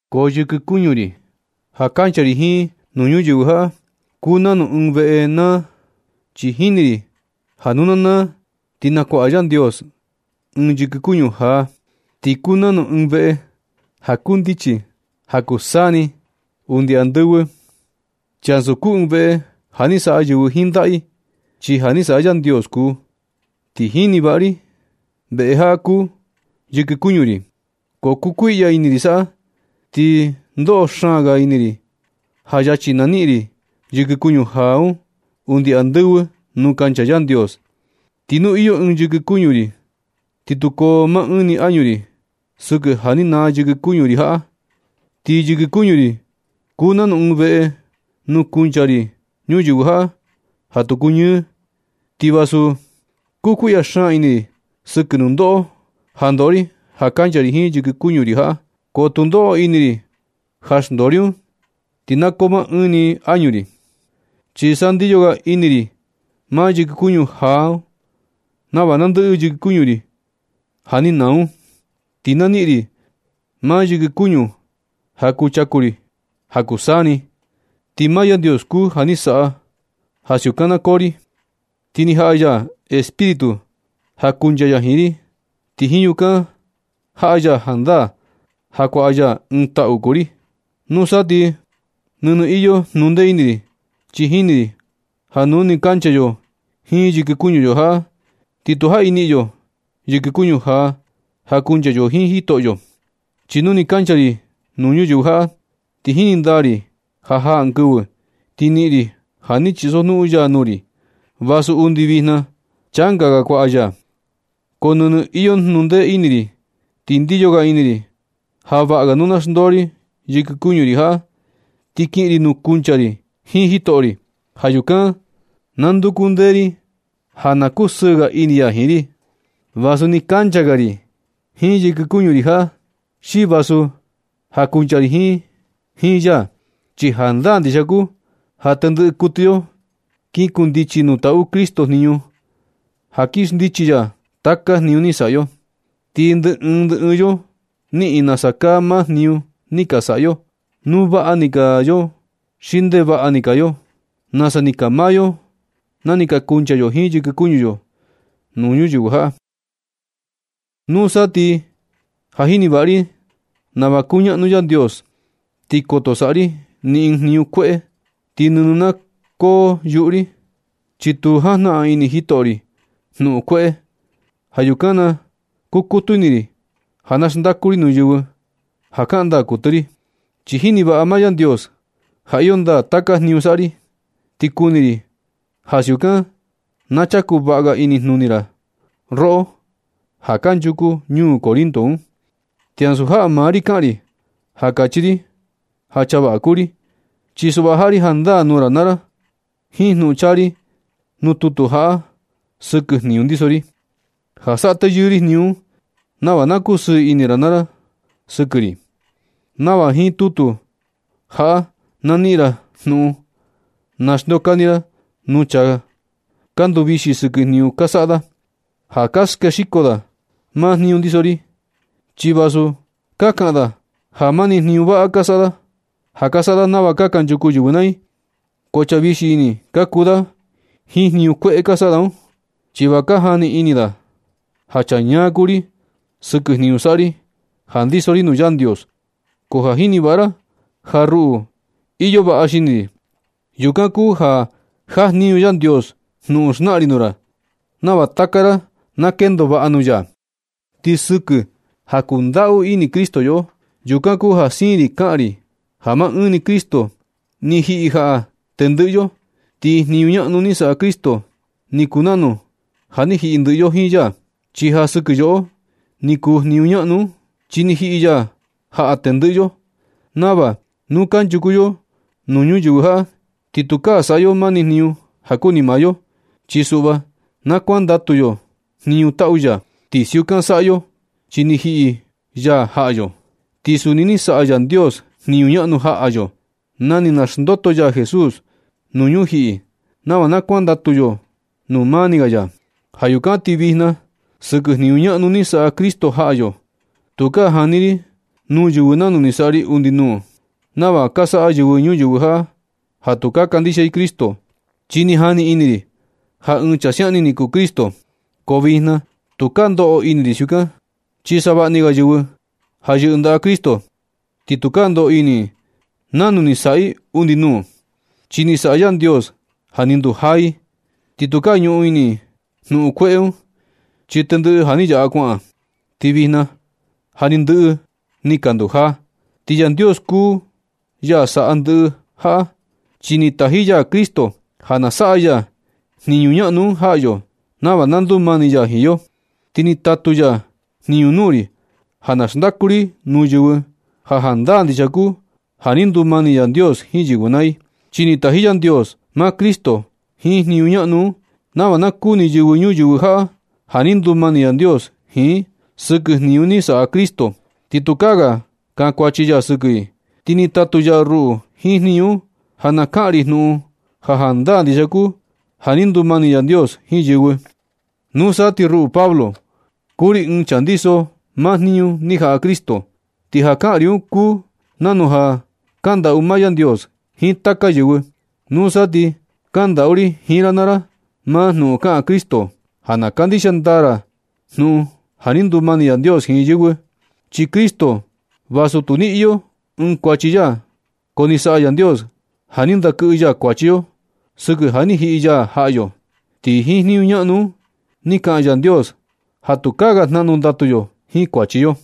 Ko yɨkɨ kuñu ri ja kancha ri jiin nuu ñuyɨvɨ jaꞌa, kuu nanu ɨɨn veꞌe naa. Chi jini ri ja nu na naa, ti nakuaꞌa Yandios ɨɨn yɨkɨ kuñu jaa, ti kuu nanu ɨɨn veꞌe ja kundichi ja kuu taka saa ni undi andɨvɨ. Chi ansu kuu ɨɨn veꞌe ja ni saꞌa yɨvɨ jiin ndaꞌa i, chi ja ni saꞌa Yandios kuu. Ti jini vaꞌa ri veꞌe jaꞌa ja kuu yɨkɨ kuñu ri, ko kukuiꞌya ini ri saꞌa, ti ndoꞌo xaan ga ini ri ja yachi naniꞌin ri yɨkɨ kuñu jaa un undi andɨvɨ nuu kancha Yandios. Ti nu iyo ɨɨn yɨkɨ kuñu ri, ti tu koo maa ɨɨn ni añu ri sɨkɨ ja ni naa yɨkɨ kuñu ri jaꞌa. Ti yɨkɨ kuñu ri kuu nanu ɨɨn veꞌe nuu kuncha ri ñuyɨvɨ jaꞌa, ja tu kuñɨɨ, ti vasu kukuiꞌya xaan ini ri sɨkɨ nundoꞌo ja ndoꞌo ri ja kancha ri jiin yɨkɨ kuñu ri jaꞌa. Ko tu ndoꞌo ini ri ja xndoo ri un ti na koo maa ɨɨn ni añu ri. Chi sa ndiyo ga ini ri maa yɨkɨ kuñu jaa un nava nandɨꞌɨ yɨkɨ kuñu ri ja ni naa un, ti na niꞌin ri maa yɨkɨ kuñu ja kuchaku ri ja kuu taka saa ni. Ti maa Yandios kuu ja ni saꞌa ja siukan na koo ri. Ti ni jaꞌa ya Espíritu ja na kuncha ya jiin ri, ti jiin yukan jaꞌa ya jandaa ja kuaꞌa ya ɨɨn taꞌu kuu ri. Nusa ti nɨnɨ iyo jnundee ini ri, chi jini ri ja nu nɨ kancha yo jiin yɨkɨ kuñu yo jaꞌa, ti tu jaꞌi niꞌin yo yɨkɨ kuñu jaa ja kuncha yo jiin Jitoꞌyo. Chi nu ni kancha ri nuu ñuyɨvɨ jaꞌa, ti jini ndaa ri ja jaa ɨɨn kɨvɨ ti niꞌin ri ja ni chisojnuꞌun ya nuu ri, vasu undi vijna changa ga kuaꞌa ya. Ko nɨnɨ iyo jnundee ini ri ti ndiyo ga ini ri ja vaꞌa ga nu na xndoo ri yɨkɨ kuñu ri jaꞌa ti kiꞌin ri nuu kuncha ri jiin jitoꞌo ri. Ja yukan na nduku ndee ri ja na kusɨɨ ga ini ya jiin ri, vasu ni kancha ga ri jiin yɨkɨ kuñu ri jaꞌa, xi vasu ja kuncha ri jiin ya. Chi jandaa ndixia kuu ja tendɨꞌɨ kuɨtɨ yo kin kundichi nuu taꞌu Cristo jniñu ja kin xndichi ya taka jniñu ni saꞌa yo. Ti ndɨ ɨɨn ndɨ ɨɨn yo niꞌin nasa kaa maa jniñu ni ka saꞌa yo, nu vaꞌa ni kaa yo xi ndevaꞌa ni kaa yo, nasa ni kaa maa yo na ni kuncha yo jiin yɨkɨ kuñu yo nuu ñuyɨvɨ jaꞌa. Nusa ti ja jini vaꞌa ri nava kuñaꞌnu Yandios, ti koto saꞌa ri ni ɨɨn jniñu kueꞌe, ti nɨnɨ na koo yuꞌu ri, chi tu jajnaꞌan ini jitoꞌo ri jnuꞌun kueꞌe. Ja yukan na kukutu ini ri ja na xndaku ri nuu yɨvɨ ja kaꞌan ndaa kuɨtɨ ri. Chi jini vaꞌa maa Yandios ja iyo ndaa taka jniñu saꞌa ri. Ti kuni ri ja siukan na chaku vaꞌa ga inijnuni ra, roꞌo ja kanchuku ñuu Corinto un. Ti ansu jaꞌa maa ri kaꞌan ri ja kachi ri ja chaa vaꞌa kuu ri. Chi suꞌva jaꞌa ri jandaa nuu ra naa ra jiin jnuꞌun chaa ri nuu tutu jaꞌa sɨkɨ jniñu ndiso ri, ja saꞌa teyɨɨ ri jniñu un, nava na kusɨɨ ini ra naa ra sɨkɨ ri, nava jiin tutu jaꞌa na niꞌin ra jnuꞌun na xndeokani ra nuu chaa ka nduvixi sɨkɨ jniñu ka saꞌa da, ja ka skexiko da maa jniñu ndiso ri. Chi vasu ka kaꞌan da ja mani jniñu vaꞌa ka saꞌa da, ja ka saꞌa da nava nasa kanchuku yɨvɨ naa i, ko chaa vixi ini ka kuu da jiin jniñu kueꞌe ka saꞌa da un. Chi va ka jani ini da ja chaa ñaa kuu ri sɨkɨ jniñu saꞌa ri ja ndiso ri nuu Yandios. Ko ka jini vaꞌa ra ja ruꞌu iyo vaꞌa xini ri. Yukan kuu ja jajniñu Yandios jnuꞌun xnaꞌan ri nuu ra, nava taka ra na kendo vaꞌa nuu ya. Ti sɨkɨ ja kundaꞌu ini Cristo yoꞌo, yukan kuu ja siin ri kaꞌan ndaa ri ja maa ɨɨn ni Cristo ni jiꞌi jaꞌa tendɨꞌɨ yo. Ti jniñu ñaꞌnu ni saꞌa Cristo, ni kuu nanu ja ni jiꞌi ndɨꞌɨ yo jiin ya, chi ja sɨkɨ yoꞌo ni kuu jniñu ñaꞌnu un. Chi ni jiꞌi ya jaꞌa tendɨꞌɨ yo nava nu kanchuku yo nuu ñuyɨvɨ jaꞌa, ti tukaa saꞌa yo mani jniñu ja kuni maa yo, chi suꞌva na kuandatu yo jniñu taꞌu ya. Ti siukan saꞌa yo chi ni jiꞌi ya jaꞌa yo. Ti suni ni saꞌa Yandios jniñu ñaꞌnu jaꞌa yo na ni naxndoto ya Jesús nuu ñujiꞌi nava na kuandatu yo nuu mani ga ya. Ja yukan ti vijna, sɨkɨ jniñu ñaꞌnu ni saꞌa Cristo jaꞌa yo, tukaa jani ri nuu yɨvɨ nanu ni saꞌa ri undi nuu, nava ka saꞌa yɨvɨ ñuyɨvɨ jaꞌa ja tu kandixia i Cristo, chi ni jani ini ri ja ɨɨn chaa siaꞌan ni ni kuu Cristo, ko vijna tukaa ndoꞌo ini ri siukan. Chi savaꞌni ga yɨvɨ ja yɨꞌɨ i ndaꞌa Cristo, ti tukaa ndoꞌo ini i nanu ni saꞌa i undi nuu, chi ni saꞌa Yandios ja ni ndujaa i. Ti tukaa ñuꞌun ini i jnuꞌun kueꞌe un, chi tendɨꞌɨ ja ni yaꞌa kuaꞌan, ti vijna ja ni ndɨꞌɨ i ni ka ndujaa. Ti Yandios kuu ya saꞌa ndɨꞌɨ jaꞌa, chi ni taji ya Cristo ja na saꞌa ya jniñu ñaꞌnu un jaꞌa yo, nava na ndumani ya jiin yo. Ti ni tatu ya jniñu nuu ri ja na xndaku ri nuu yɨvɨ ja jandaa ndixia kuu ja ni ndumani Yandios jiin yɨvɨ naa i. Chi ni taji Yandios maa Cristo jiin jniñu ñaꞌnu un, nava na kuni yɨvɨ ñuyɨvɨ jaꞌa ja ni ndumani Yandios jiin i sɨkɨ jniñu ni saꞌa Cristo, ti tukaa ga kankuachi ya sɨkɨ i. Ti ni tatu ya ruꞌu jiin jniñu un ja na kaꞌan ri jnuꞌun ja jandaa ndixia kuu ja ni ndumani Yandios jiin yɨvɨ. Nusa ti ruꞌu Pablo, kuu ri ɨɨn chaa ja ndiso maa jniñu ni jaꞌa Cristo. Ti ja kaꞌan ri un kuu nanu ja kandaꞌu maa Yandios jiin taka yɨvɨ. Nusa ti kandaꞌu ri jiin ra naa ra maa jnuꞌun ja kaꞌan Cristo ja na kandixia ndaa ra jnuꞌun ja ni ndumani Yandios jiin yɨvɨ. Chi Cristo, vasu tu ni iyo ni ɨɨn kuachi ya, ko ni saꞌa Yandios ja ni ndakɨꞌɨ ya kuachi yo sɨkɨ ja na ni jiꞌi ya jaꞌa yo. Ti jiin jniñu ñaꞌnu un ni kaꞌan Yandios ja tukaa ga jnaꞌnu ndatu yo jiin kuachi yo.